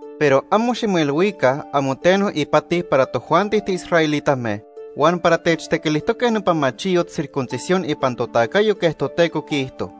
Pero amo ximoilhuica amo teno ipati para tojuanti tiisraelitame huan para techtequilijtoque nopa machiyot circuncisión ipan totacayo quej Toteco quiijto.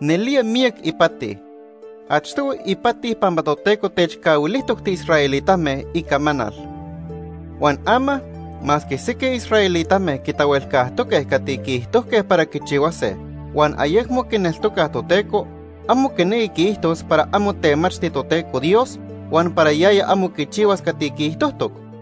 Nelía miyac ipati. Achtohui ipati pampa Toteco techcahuilijtoc tiisraelitame Icamanal. Huan ama, masque sequij israelitame quitahuelcajtoque cati quiijtojque para quichihuase huan ayecmo quineltocaj Toteco, amo quinequi quiijtos para amo temachti Toteco Dios, huan para yaya amo quichihuas cati quiijtojtoc.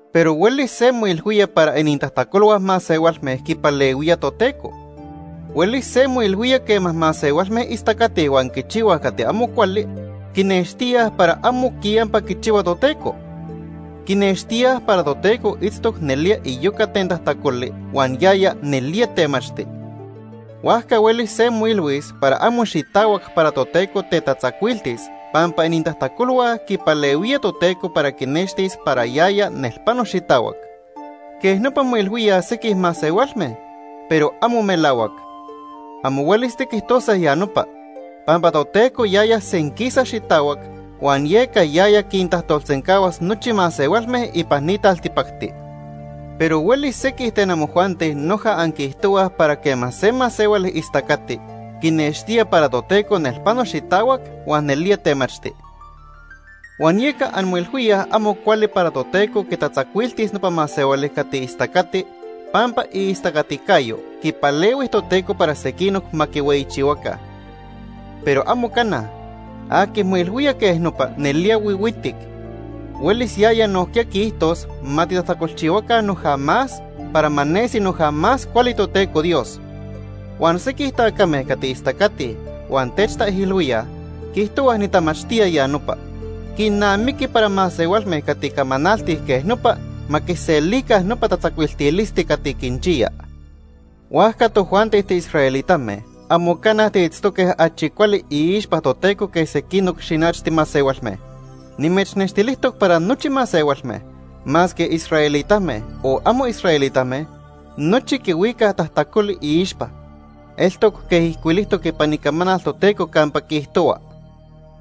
Pero huelis se moilhuía para inintajtacolhua masehualme quipalehuía Toteco. Huelis se moilhuía quema masehualme istacatij huan quichihuaj cati amo cuali, quinextíaj para amo quiyampa quichihua Toteco. Quinextíaj para Toteco itztoc nelía iyoca ten tajtacoli huan yaya nelía temachti. Huajca huelis se moilhuis para amo xitahuac para Toteco tetatzacuiltis pampa inintajtacolhua quipalehuía Toteco para quinextis para yaya nelpano xitahuac. Quej nopa moilhuíaj sequij masehualme, pero amo melahuac. Amo huelis tiquijtose ya nopa. Pampa Toteco yaya senquisa xitahuac, huan yeca yaya quintajtolsencahuas nochi masehualme ipan ni taltipacti. Pero huelis sequij ten amojuanti noja anquiijtohuaj para quema se masehuali istacati, quinextía para Toteco nelpano xitahuac huan nelía temachti. Huan yeca anmoilhuíaj amo cuali para Toteco quitatzacuiltis nopa masehuali cati istacati pampa iistacaticayo quipalehui Toteco para sequinoc ma quihueyichihuaca. Pero amo cana. Aqui moilhuía quej nopa nelía huihuitic. Huelis yaya nojquiya quiijtos ma titajtacolchihuaca noja más para ma nesi noja más cuali Toteco Dios. Huan sequij tacame cati istacatij huan techtaijilhuíaj, quiijtohuaj nitamachtía ya nopa. Quinamiqui para masehualme cati camanaltij quej nopa ma quiselica nopa tatzacuiltilisti cati quinchiya. Huajca tojuanti tiisraelitame amo cana tiitztoque achi cuali iixpa Toteco que sequinoc xinachti masehualme. Nimechnextilijtoc para nochi masehualme, masque israelitame o amo israelitame, nochi quihuicaj tajtacoli iixpa. Eltoc quej ijcuilijtoc ipan Icamanal Toteco campa quiijtohua: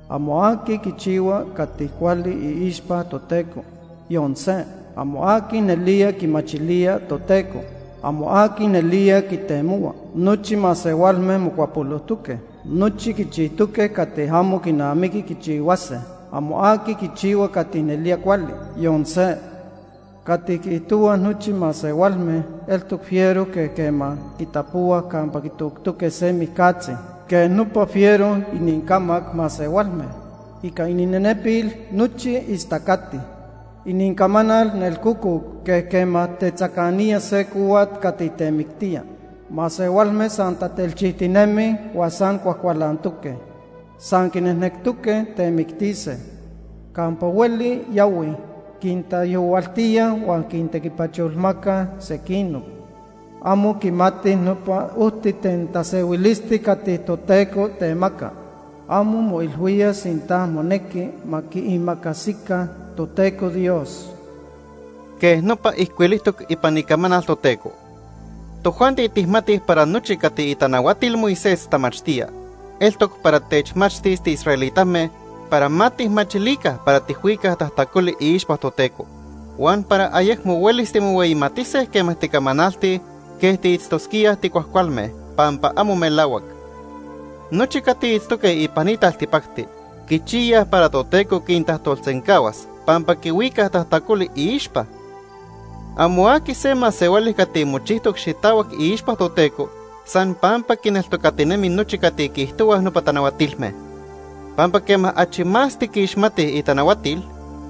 “Amo aqui quichihua cati cuali iixpa Toteco, yon se. Amo aqui nelía quimachilía Toteco. Amo aqui nelía quitemohua. Nochi masehualme mocuapolojtoque. Nochi quichijtoque cati amo quinamiqui quichihuase. Amo aqui quichihua cati nelía cuali. Yon se. Cati quiijtohuaj nochi masehualme eltoc fiero quej quema quitapohuaj campa quitoctoque se mijcatzi. Quej nopa fiero inincamac masehualme. Ica ininenepil nochi istacatij. Inincamanal nelcococ quej quema tetzacanía se cohuat cati temictía. Masehualme san tatelchijtinemij huan san cuajcualantoque. San quinejnectoque temictise. Campa hueli yahuij, quintaijyohuiltíaj huan quintequipacholmacaj sequinoc. Amo quimatij nopa ojti ten tasehuilisti cati Toteco temaca. Amo moilhuíaj sinta monequi ma quiimacasica Toteco Dios.” Quej nopa ijcuilijtoc ipan Icamanal Toteco. Tojuanti tijmatij para nochi cati itanahuatil Moisés tamachtía, eltoc para techmachtis tiisraelitame para ma tijmachilica para tijhuicaj tajtacoli iixpa Toteco, huan para ayecmo huelis timohueyimatise quema ticamanaltij quej tiitztosquíaj ticuajcualme, pampa amo melahuac. Nochi cati itztoque ipan ni taltipacti quichiyaj para Toteco quintajtolsencahuas pampa quihuicaj tajtacoli iixpa. Amo aqui se masehuali cati mochijtoc xitahuac iixpa Toteco san pampa quineltocatinemi nochi cati quiijtohuaj nopa tanahuatilme. Pampa quema achi más tiquixmatij itanahuatil,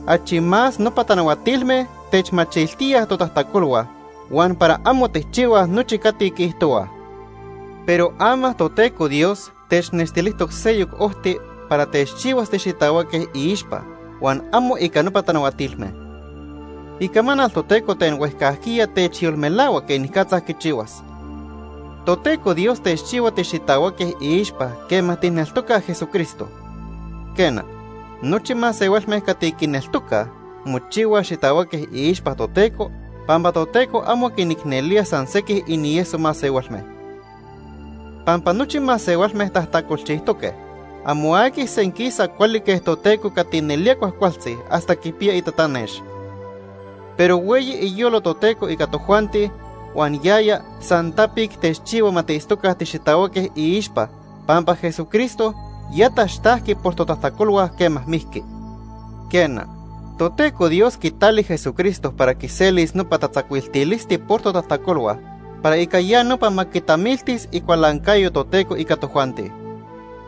achi más nopa tanahuatilme techmachiltíaj totajtacolhua huan para amo tijchihuaj nochi cati quiijtohuaj. Pero ama Toteco Dios technextilijtoc seyoc ojti para techchihuas tixitahuaque iixpa huan amo ica nopa tanahuatilme. Icamanal Toteco ten huejcajquiya techyolmelahua quenicatza quichihuas. Toteco Dios techchihua tixitahuaque iixpa quema tijneltocaj Jesucristo. Quena, nochi masehualme cati quineltocaj mochihuaj xitahuaque iixpa Toteco pampa Toteco amo quinicnelía san sequij inieso masehualme. Pampa nochi masehualme tajtacolchijtoque. Amo aqui senquisa cuali quej Toteco cati nelía cuajcualtzi hasta quipiya itatanex. Pero hueyi iyolo Toteco ica tojuanti huan yaya san tapic techchihua ma tiitztoca tixitahuaque iixpa, pampa Jesucristo ya taxtajqui por totajtacolhua quema mijqui. Quena, Toteco Dios quitali Jesucristo para quiselis nopa tatzacuiltilisti por totajtacolhua, para ica ya nopa ma quitamiltis icualancayo Toteco ica tojuanti.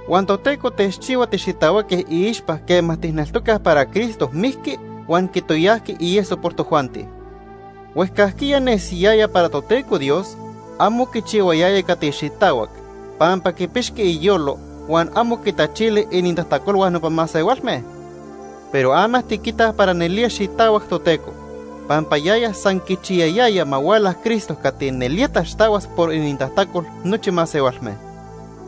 Huan Toteco techchihua tixitahuaque iixpa quema tijneltocaj para Cristo mijqui huan quitoyajqui ieso por tojuanti. Huejcajquiya nesiyaya para Toteco Dios amo quichihuayaya cati xitahuac pampa quipixqui iyolo huan amo quitachili inintajtacolhua nopa masehualme. Pero ama tiquitaj para nelía xitahuac Toteco, pampa yaya san quichiyayaya ma huala Cristo cati nelía taxtahuas por inintajtacol nochi masehualme.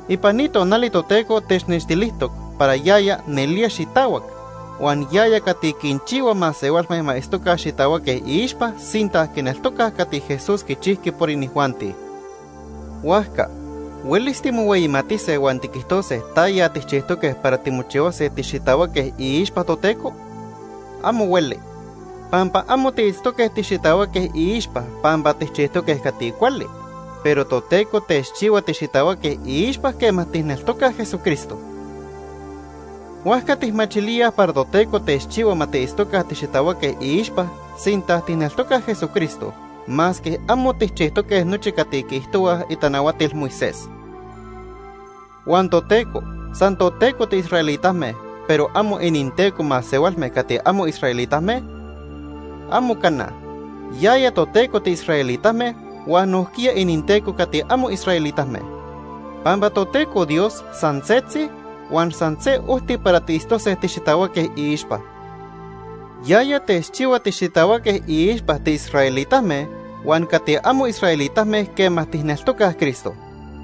Ipan ni tonali Toteco technextilijtoc para yaya nelía xitahuac, huan yaya cati quinchihua masehualme ma itztoca xitahuaque iixpa sinta quineltocaj cati Jesús quichijqui por inijuanti. Huajca ¿huelis timohueyimatise huan tiquijtose taya tijchijtoque para timochihuase tixitahuaque iixpa Toteco? Amo hueli. Pampa amo tiitztoque tixitahuaque iixpa pampa tijchijtoque cati cuali, pero Toteco techchihua tixitahuaque iixpa quema tijneltocaj Jesucristo. Huajca tijmachilíaj para Toteco techchihua ma tiitztoca tixitahuaque iixpa sinta tijneltocaj Jesucristo, masque amo tijchijtoque nochi cati quiijtohuaj itanahuatil Moisés. ¿Huan Toteco san toTeco tiisraelitame, pero amo ininTeco masehualme cati amo israelitame? ¡Amo cana! Yaya Toteco tiisraelitame huan nojquiya ininTeco cati amo israelitame. Pampa Toteco Dios san setzi huan san se ojti para tiitztose tixitahuaque iixpa. Yaya techchihua tixitahuaque iixpa tiisraelitame huan cati amo israelitame quema tijneltocaj Cristo.